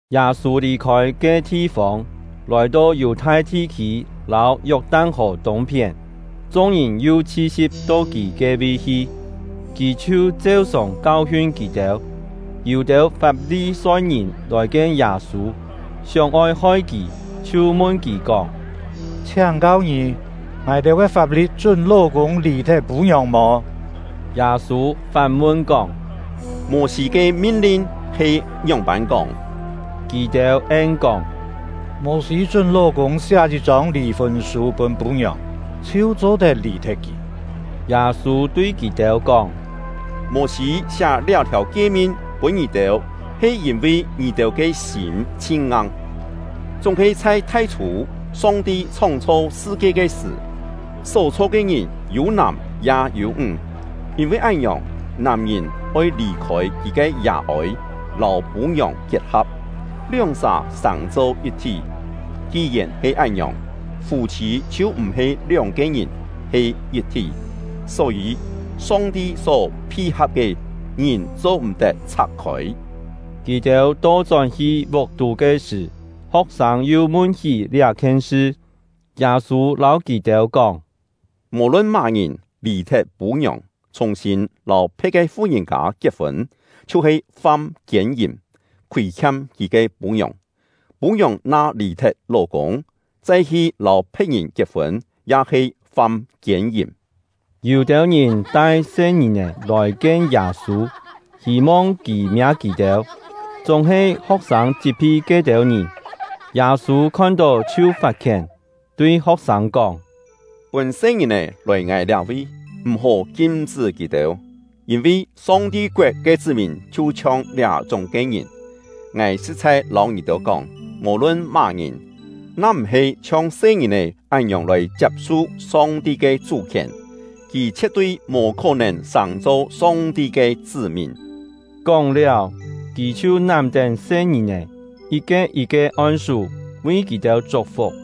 Yâ-sû lì-khôi ke thi-fông, lòi-to Yù-thai thi-khî lâu Yok-tan-hò tûng-phién. Chung-ngìn yu chhi-si̍p to kì ke-vi hi, kì chhiu cheu-sòng kau-hiun kì-têu. Yû-têu Fap-li-soi-ngìn lòi-kien Yâ-sû, sióng-oi hoi kì, chhiu mun kì kóng: “Chhiáng-kau ngì, ngài-têu ke fap-li̍t chún ló-kûng lì-thet pû-ngiòng mò?” Yâ-sû fán-mun kóng: “Mô-sî ke min-lin he ngióng-pân kóng?” Kì-têu en-kóng: “Mô-sî chún ló-kûng siá yit-chông lì-fûn sû pûn pû-ngiòng, chhiu cho-tet lì-thet kì.” Yâ-sû tui kì-têu kóng: “Mô-sî siá liá-thiàu kie-min pûn ngì-têu he yîn-vi ngì-têu ke sîm chhin-ngang. Chúng-he chhai thai-chhû, Song-ti chhóng-chho sṳ-kie ke sṳ̀, só-chho ke ngìn ‘yû nàm ya yû ńg’; ‘yîn-vi án-ngiòng, nàm-ngìn oi lì-khôi kì ke yà-ôi, lâu pû-ngiòng kiet-ha̍p, lióng-sà sàng-cho yit-thí.’ Ki-yèn he án-ngiòng, fû-chhî chhiu m̀-he lióng-ke ngìn, he yit-thí. Só-yî, Song-ti só phi-ha̍p ke, ngìn cho-m̀-tet chhak-khôi.” Kì-têu to-chón-hi vuk-tú ke sṳ̀, ho̍k-sâng yu mun-hí liá-khien sṳ. Yâ-sû lâu kì-têu kóng: “Mò-lun má-ngìn lì-thet pû-ngiòng, chhùng-sîn lâu phe̍t ke fu-ngìn-kâ kiet-fûn, chhiu-he fam kiên-yìm, khûi-khiam kì ke pû-ngiòng; pû-ngiòng na lì-thet ló-kûng, chai hi lâu phe̍t-ngìn kiet-fûn, ya he fam kiên-yìm.” Yû-têu ngìn tai se-ngìn-è lòi-kien Yâ-sû, hî-mong kì miâ kì-têu; chúng-he ho̍k-sâng chit-phi ke-têu ngìn. Yâ-sû khon-tó chhiu fat-khién, tui ho̍k-sâng kóng: “Pûn se-ngìn-è lòi ngài liá-vi, m̀-hó kim-chṳ́ kì-têu, yîn-vi Song-ti koet ke chṳ́-mìn chhiu-chhiong liá-chúng ke ngìn. Ngài sṳ̍t-chhai lâu ngì-têu kóng, mò-lun má-ngìn, na m̀-he chhiong se-ngìn-è án-ngiòng lòi chiap-su Song-ti ke chú-khièn, kì chhie̍t-tui mò khó-nèn sàng-cho Song-ti ke chṳ́-mìn.” Kóng-liáu, kì chhiu nám-tén se-ngìn-è, yit-ke yit-ke on-sú, vi kì-têu chuk-fuk.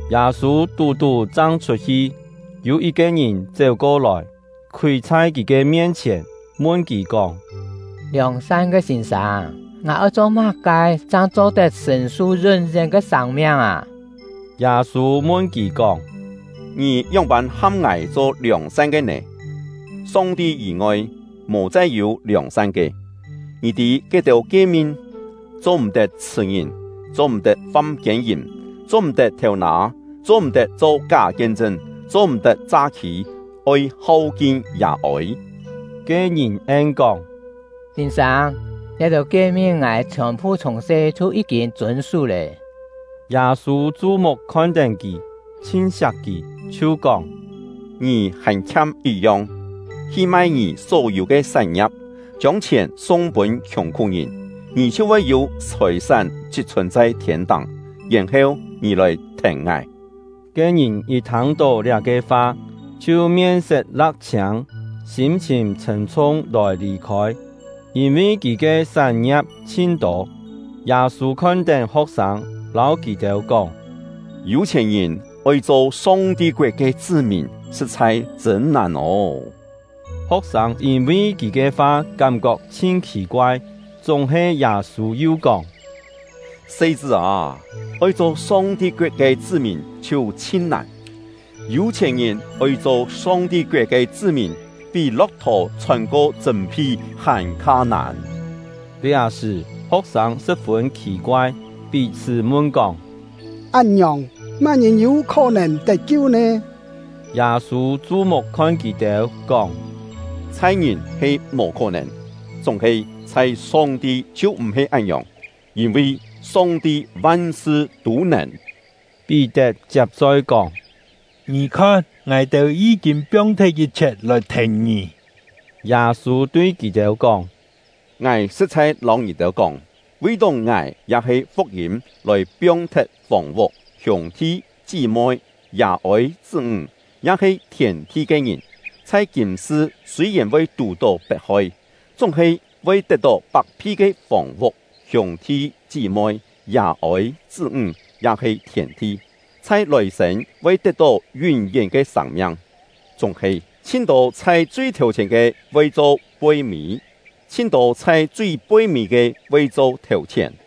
Yâ-sû tú-tú chang chhut-hi, yû yit-ke ngìn chéu-ko-lòi, khúi chhai kì ke mien-chhièn, mun kì kóng: “Liòng-san ke sîn-sâng, ngài oi cho má-ke chang cho-tet sṳ̀n-su yún-yén ke sâng-miang â?” Yâ-sû mun kì kóng: “Ngì ngióng-pân ham ngài cho liòng-san ke nè? Song-ti yî-ngoi, mò chai yû liòng-san ke. Ngì tî ke-têu kie-min: ‘Cho-m̀-tet chhṳ̀-ngìn; cho-m̀-tet fam kiên-yìm; cho-m̀-tet thêu-nâ; cho-m̀-tet cho ká kien-chṳn; cho-m̀-tet cha-khî; oi hau-kin yà-ôi.’” Ke ngìn en-kóng: “Sîn-sâng, liá-têu kie-min ngài chhiòn-phu chhiùng-se chhiu yí-kîn chûn-sú lé.” Yâ-sû chu-muk khon-tén kì, chhin siak kì, chhiu kóng: “Ngì hàn khiam yit-yong. Hi mai ngì só-yû ke sán-ngia̍p, chiông chhièn sung-pûn khiùng-khú-ngìn, ngì chhiu voi yû chhòi-sán chit-chhùn chhai thiên-táng; yèn-heu ngì lòi thèn ngài.” Ke ngìn yit thâng-tó liá-ke fa, chhiu mien-set la̍k-chhiâng, sîm-chhìn chhṳ̀m-chhung lòi lì-khôi, yîn-vi kì ke sán-ngia̍p chhin-tô. Yâ-sû khon-tén ho̍k-sâng, lâu kì-têu kóng: “Yû-chhièn-ngìn oi cho Song-ti koet ke chṳ́-mìn, sṳ̍t-chhai chṳ̂n nàn ô!” Ho̍k-sâng yîn-vi kì ke fa kám-kok chhin khì-koai; chúng-he Yâ-sû yu kóng: “Se-chṳ́ â, oi cho Song-ti koet ke chṳ́-mìn chhiu chhin nàn! Yû-chhièn-ngìn oi cho Song-ti koet ke chṳ́-mìn, pí lo̍k-thò chhôn-ko chṳ̂m-phi hàn-kha nàn!” Liá-sṳ̀, ho̍k-sâng sṳ̍p-fûn khì-koai, pí-chhṳ́ mun-kóng: “Án-ngiòng, má-ngìn yû khó-nèn tet-kiu nè?” Yâ-sû chu-muk khon kì-têu, kóng: “Chhai ngìn he mò khó-nèn, chúng-he chhai Song-ti chhiu m̀-he án-ngiòng, yîn-vi Song-ti van-sṳ tû nèn.” Pí-tet chiap-choi kóng: “Ngì khon, ngài-têu yí-kîn piong-thet yit-chhiet lòi thèn ngì.” Yâ-sû tui kì-têu kóng: “Ngài sṳ̍t-chhai lâu ngì-têu kóng, vi-tó ngài ya-he fuk-yîm lòi piong-thet fòng-vuk, hiûng-thi, chí-moi, yà-ôi, chṳ́-ńg, ya-he thièn-thi ke ngìn, chhai kîm-sṳ sûi-yèn voi tù-tó pet-hoi, chúng-he voi tet-tó pak-phi ke fòng-vuk, hiûng-thi, chí-moi, yà-ôi, chṳ́-ńg, ya-he thièn-thi; chhai lòi-sên voi tet-tó yún-yén ke sâng-miang. Chúng-he, chhin-tô chhai chui thèu-chhièn ke voi cho poi-mî; chhin-tô chhai chui poi-mî ke voi cho thèu-chhièn.”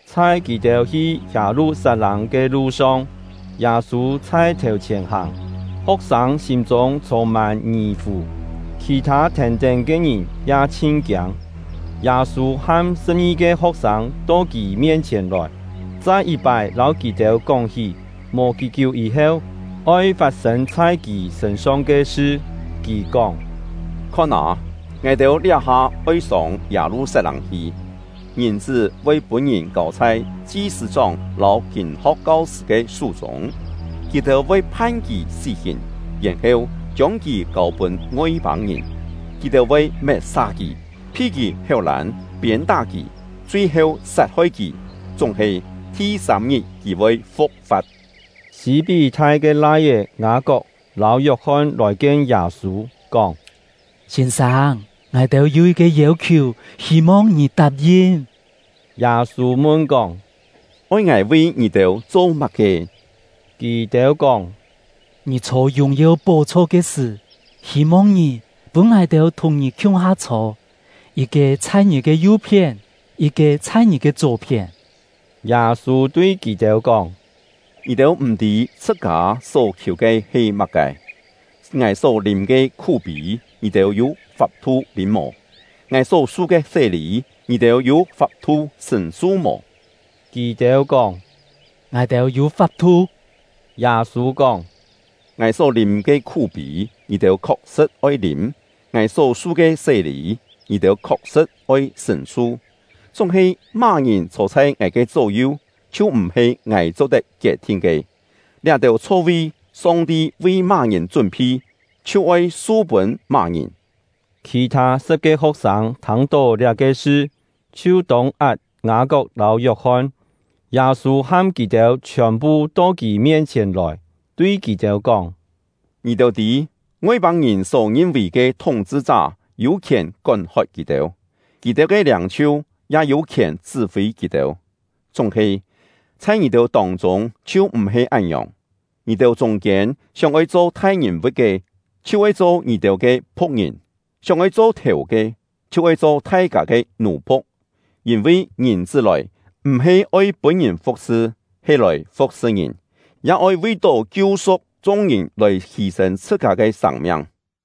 Chhai kì-têu hi Yâ-lu-sat-lâng ke lu-song, Yâ-sû chhai thèu-chhièn hàng. Ho̍k-sâng sîm-chûng chhûng-mân ngì-fù; khì-thâ thèn-tén ke ngìn ya chhin kiâng. Yâ-sû ham sṳ̍p-ngi-ke ho̍k-sâng to kì mien-chhièn lòi, chai yit-pái lâu kì-têu kóng-hí mò kí-kiú yî-heu oi fat-sên chhai kì sṳ̂n-song ke sṳ. Kì kóng: “Khon â, ngài-têu liá-ha oi sông Yâ-lu-sat-lâng hi; Ngìn-chṳ́ voi pûn-ngìn kâu chhai chi-sṳ̂-chóng lâu kîn-ho̍k kau-sṳ̂ ke sú-chûng. Kì-têu voi phan kì sí-hìn, yèn-heu chiông kì kâu-pûn Ngoi-pâng-ngìn. Kì-têu voi met-sa kì, phi kì héu-lân, piên-tá kì, chui-heu sat-hoi kì; chúng-he, thi-sâm-ngit kì voi fu̍k-fa̍t.” Sî-pí-thai ke lai-é Ngâ-kok lâu Yok-hon lòi-kien Yâ-sû, kóng: “Sîn-sâng, ngài-têu yû yit-ke yêu-khiù, hî-mong ngì tap-yin.” Yâ-sû mun-kóng: “Oi ngài vi ngì-têu cho má-ke?” Kì-têu kóng: “Ngì chhô yùng-yeu pó-chho ke sṳ̀, hî-mong ngì pûn ngài-têu thùng ngì khiung-ha chhô, yit-ke chhai ngì ke yu-phién, yit-ke chhai ngì ke chó-phién.” Yâ-sû tui kì-têu kóng: “Ngì-têu m̀-tî chhṳ-kâ só khiù ke he má-ke. Ngài só lîm ke khú-pî, ngì-têu yû fap-thu lîm mò? Ngài só su ke sé-lî, ngì-têu yû fap-thu sṳ̀n-su mò?” Kì-têu kóng: “Ngài-têu yû fap-thu!” Yâ-sû kóng: “Ngài só lîm ke khú-pî, ngì-têu khok-sṳ̍t oi lîm, ngài só su ke sé-lî, ngì-têu khok-sṳ̍t oi sṳ̀n-su; chúng-he má-ngìn chhô chhai ngài ke chó-yu, chhiu m̀-he ngài cho-tet kiet-thin ke. Liá-têu chho-vi, Song-ti vi má-ngìn chún-phi, chhiu oi su-pûn má-ngìn.” Khì-thâ sṳ̍p-ke ho̍k-sâng thâng-tó liá-ke sṳ, chhiu tông-at Ngâ-kok lâu Yok-hon. Yâ-sû ham kì-têu chhiòn-phu to kì mien-chhièn lòi, tui kì-têu kóng: “Ngì-têu tî, Ngoi-pâng-ngìn só ngin-vì ke thúng-chhṳ-chá yû khièn kón-hot kì-têu, kì-têu ke liâng-chhiu ya yû khièn chṳ́-fî kì-têu; chúng-he, chhai ngì-têu tông-chûng chhiu m̀-he án-ngiòng. Ngì-têu chûng-kiên sióng-oi cho thai-ngìn-vu̍t ke, chhiu oi cho ngì-têu ke phu̍k-ngìn; sióng-oi cho thèu ke, chhiu oi cho thai-kâ ke nù-phu̍k. Yîn-vi Ngìn-chṳ́ lòi, m̀-he oi pûn-ngìn fu̍k-sṳ, he lòi fu̍k-sṳ ngìn, ya oi vi-tó kiu-su̍k chung-ngìn lòi hî-sên chhṳ-kâ ke sâng-miang.”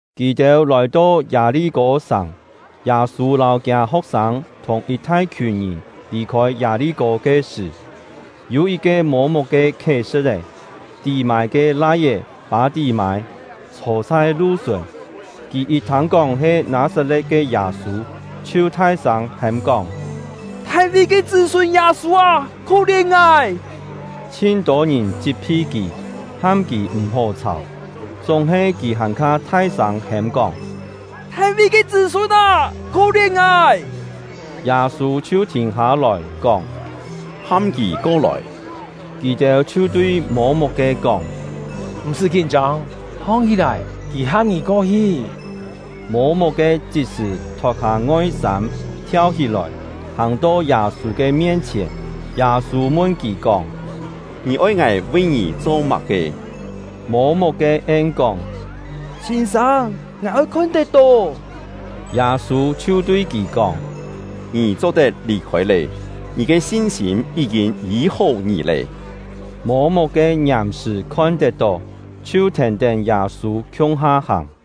Kì-têu lòi-to Yâ-li-kô-sàng. Yâ-sû lâu kiâ ho̍k-sâng thùng yit thai-khiùn ngìn lì-khôi Yâ-li-kô ke sṳ̀, yû yit-ke mô-muk ke khiet-sṳ̍t-é — Tí-mâi ke lai-é Pâ-tí-mâi, chhô chhai lu-sùn. Kì yit thâng-kóng he Nâ-sat-le̍t ke Yâ-sû, chhiu thai-sâng hêm-kóng: “Thai-ví ke chṳ́-sûn Yâ-sû â, khó-lièn ngài!” Chhin-tô ngìn chit-phi kì, ham kì m̀-hó chhàu. Chúng-he kì hàn-kha thai-sâng hêm-kóng: “Thai-ví ke chṳ́-sûn â, khó-lièn ngài!” Yâ-sû chhiu thìn hâ-lòi, kóng: “Ham kì ko-lòi.” Kì-têu chhiu tui mô-muk-ke kóng: “M̀-sṳ́ kín-chông, hong-hí-lòi, kì ham ngì ko-hi!” Mô-muk-ke chit-sṳ̀ thot-hâ ngoi-sâm, thiau-hí-lòi, hàng-to Yâ-sû ke mien-chhièn. Yâ-sû mun kì kóng: “Ngì oi ngài vi ngì cho má-ke?” Mô-muk-ke en-kóng: “Sîn-sâng, ngài oi khon-tet-tó!” Yâ-sû chhiu tui kì kóng: “Ngì cho-tet lì-khôi lé! Ngì ke sin-sîm yí-kîn yî-hó ngì lé.” Mô-muk-ke ngiàm-sṳ̀ khon-tet-tó, chhiu thèn-tén Yâ-sû khiung-ha hàng.